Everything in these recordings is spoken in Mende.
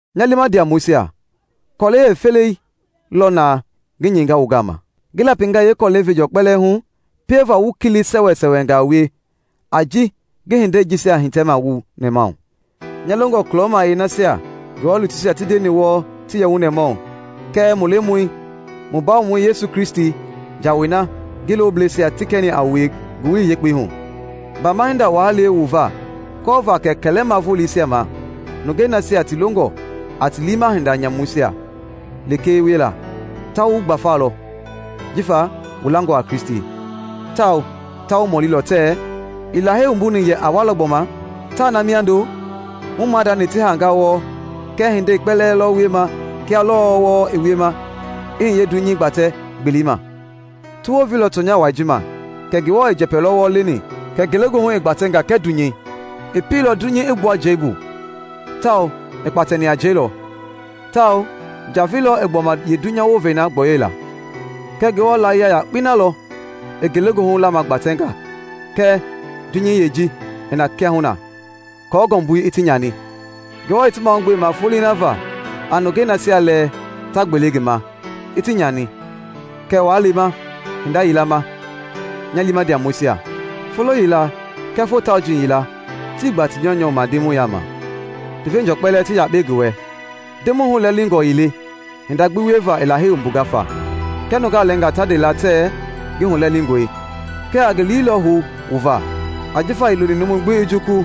Nya liima ndiamɔisia, kɔlɛi yeefeleyei lɔ naa ngi nyɛinga wu gama. Ngi lapinga yeekɔlɛi veenjɔɔ kpɛlɛɛ hu pieva wu kili sɛwɛsɛwɛngaa wie a ji ngi hindei jisia hitɛma wu nɛmahu. Nya longɔ kulɔmayiɛi nasia Ngewɔ lutuisia ti ndeni wɔɔ ti yɛ wu nɛmahu, kɛɛ mu Lemɔi, mu Bawomɔi Kristi jawei na ngi looblɛisia ti kɛni a wue Ngowili Yekpei hu. Baama hinda waa le wu va kɔɔva kɛ kɛlɛma voleisia ma, nungei nasia ti longɔ a ti liima hinda nyamuisia lekee wiela, ta wu gbafalɔ jifa wu langɔ a Kristi, tawao ta wu mɔlilɔ tɛɛ, “Ii Lahei wumbuni yɛ a walɔ gbɔma? Taa na mindo? Mu maadani ti haanga wɔɔ, kɛɛ hindei kpɛlɛɛ lɔ wiema kia lɔɔ wɔɔ i wiema i hiye dunyei gbatɛ-gbelei ma!” Ti wounveilɔ tɔnya wai ji ma kɛ Ngewɔ i njɛpɛ lɔ wɔɔ leni kɛ ngelegoohu i gbatɛnga kɛɛ dunyei. I pieilɔ dunyei i gbua njɛi bu tawao i kpatɛni a njɛi lɔ, tawao njavei lɔ i gbɔma yeedunya wovei na gbɔyɔila. Kɛɛ Ngewɔ laayia yakpei na lɔ i ngelegoohu lamagbatɛnga kɛɛ dunyei yeeji i na kiahuna aako ngɔmbui i ti nyani. Ngewɔ i ti mahugbema folei na va a nungei nasia lɛɛ ta gbele ngi ma, i ti nyani. Kɛɛ waa lema hinda yila ma, nya liima ndiamɔisia; folo yila kɛɛ foo tauji yila tii gba ti nyɔunyɔu ma Ndemɔi yaama, ti veenjɔɔ kpɛlɛɛ ti yakpe ngi wɛ. Ndemɔi hulɛlingɔ ii le hinda gbi wieva i Lahei wumbunga fa, kia nungaa lɛɛngaa ta nde la tɛɛ ngi hulɛlingɔe, kɛɛ a ngi liilɔ hou wu va, ajifa ii loni numu gbi i jukulu,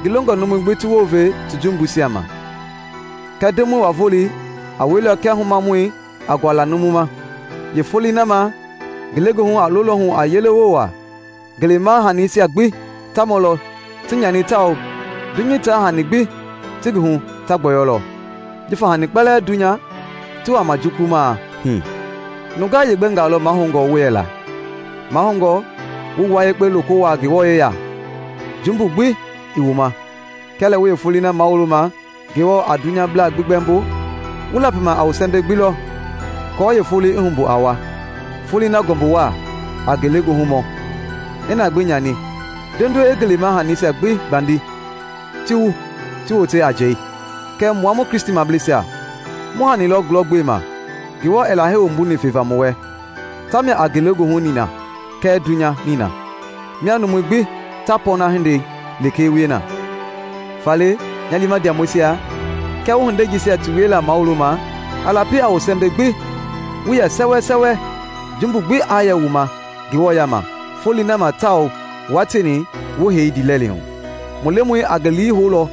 ngi longɔ numui gbi ti wounve ti jumbuisia ma. Kɛɛ Ndemɔi wa-Volei a weilɔ kia humamɔi a guala numu ma. Yeefolei na ma, ngelegoohu a lolɔ hu a yelewoo waa, ngelema hanisia gbi ta mɔlɔ ti nyani tawao dunyei taa hani gbi ti ngi hu ta gbɔyɔlɔ. Jifa hani kpɛlɛɛ dunya ti wama jukulumaa hii, nungaa yeegbɛngaa lɔ mahoungɔ wu yɛla? Mahoungɔ wu wua yekpe loko wuaa Ngewɔ yeya, jumbu gbi ii wu ma, kia lɛ wu yeefolei na mawuloma Ngewɔ a dunyablaa gbi gbɛmbo, wu lapima a wu sɛmbɛi gbi lɔ aako yeefolei i humbu a wa, folei na ngɔmbu waa a ngelegoohu mɔ i na gbi nyani, nduenduei i ngelema hanisia gbi gbandi ti wu ti wote a njɛi. Kɛɛ mua mu Kristimableisia, mu hani na lɔ gulɔgbema Ngewɔ i Lahei wumbuni feva mu wɛ; tamia a ngelegoohu nina kɛɛ dunya nina, mia numui gbi ta pɔɔna hindei lekee wie na. Faale, nya liima ndiamɔisia, kia wu hindei jisia ti wiela mawuloma, a lapi a wu sɛmbɛi gbi wu yɛ sɛwɛsɛwɛ, jumbu gbi aa yɛ wu ma Ngewɔ yaama Folei na ma tawao wua tieni wu hei ndiilɛli hu. Mu Lemɔi a ngi lii houlɔ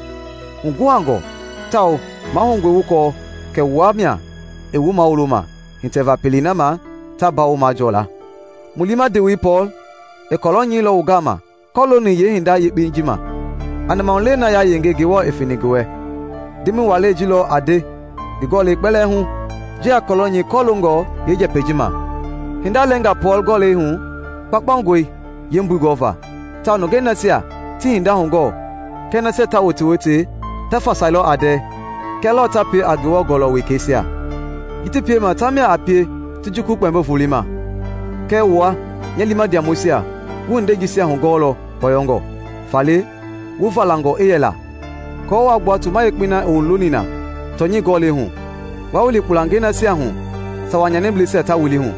huguhangɔ tawao mahoungɔe wu kɔɔ kɛ wua mia i wu mawuloma hitɛva pelei na ma ta mbawo majɔɔ la. Mu liima ndewei Pɔɔl i kɔlɔ nyɛilɔ wu gama kɔlooni yeehinda yakpei ji ma, a nɛmahulewei na yayenge Ngewɔ i feni ngi wɛ. Ndemɔi walɛi ji lɔ a nde ngi gɔlɛi kpɛlɛɛ hu ji a kɔlɔ nyɛi kɔloongɔ yeenjɛpɛi ji ma. Hinda lɛɛnga Pɔɔl gɔlɛisia hu kpaukpaungɔe yeembui gɔva tawao nungei nasia tii hinda hugɔɔ kɛɛ nasia ta wotewote ta fasailɔ a ndɛɛ, kia lɔɔ ta pie a Ngewɔ Gɔlɔ wekɛisia. Ji ti piema tamia a pie ti jukulu Kpɛmbo Volei ma. Kɛɛ wua, nya liima ndiamɔisia, wu hindei jisia hugɔɔlɔ kpɔyɔngɔ. Faale, wu valangɔ i yɛla aako waa gbua toma yekpei na i wu looni na tɔnyɛi gɔlɛi hu, waa wili kpulangei nasia hu sawa nyanibleisia ta wili hu.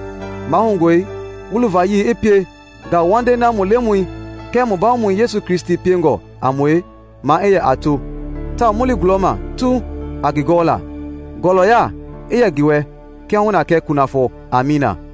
Mahoungɔe wu luvayii i pie ngauwandei na mu Lemɔi kɛɛ mu Bawomɔi Yesu Kristi piengɔ a mue maa i yɛ a to tawao mu li gulɔma tuu a ngi gɔɔla, Ngɔlɔya i yɛ ngi wɛ kiahuna kɛɛ kunafɔ. Amiina!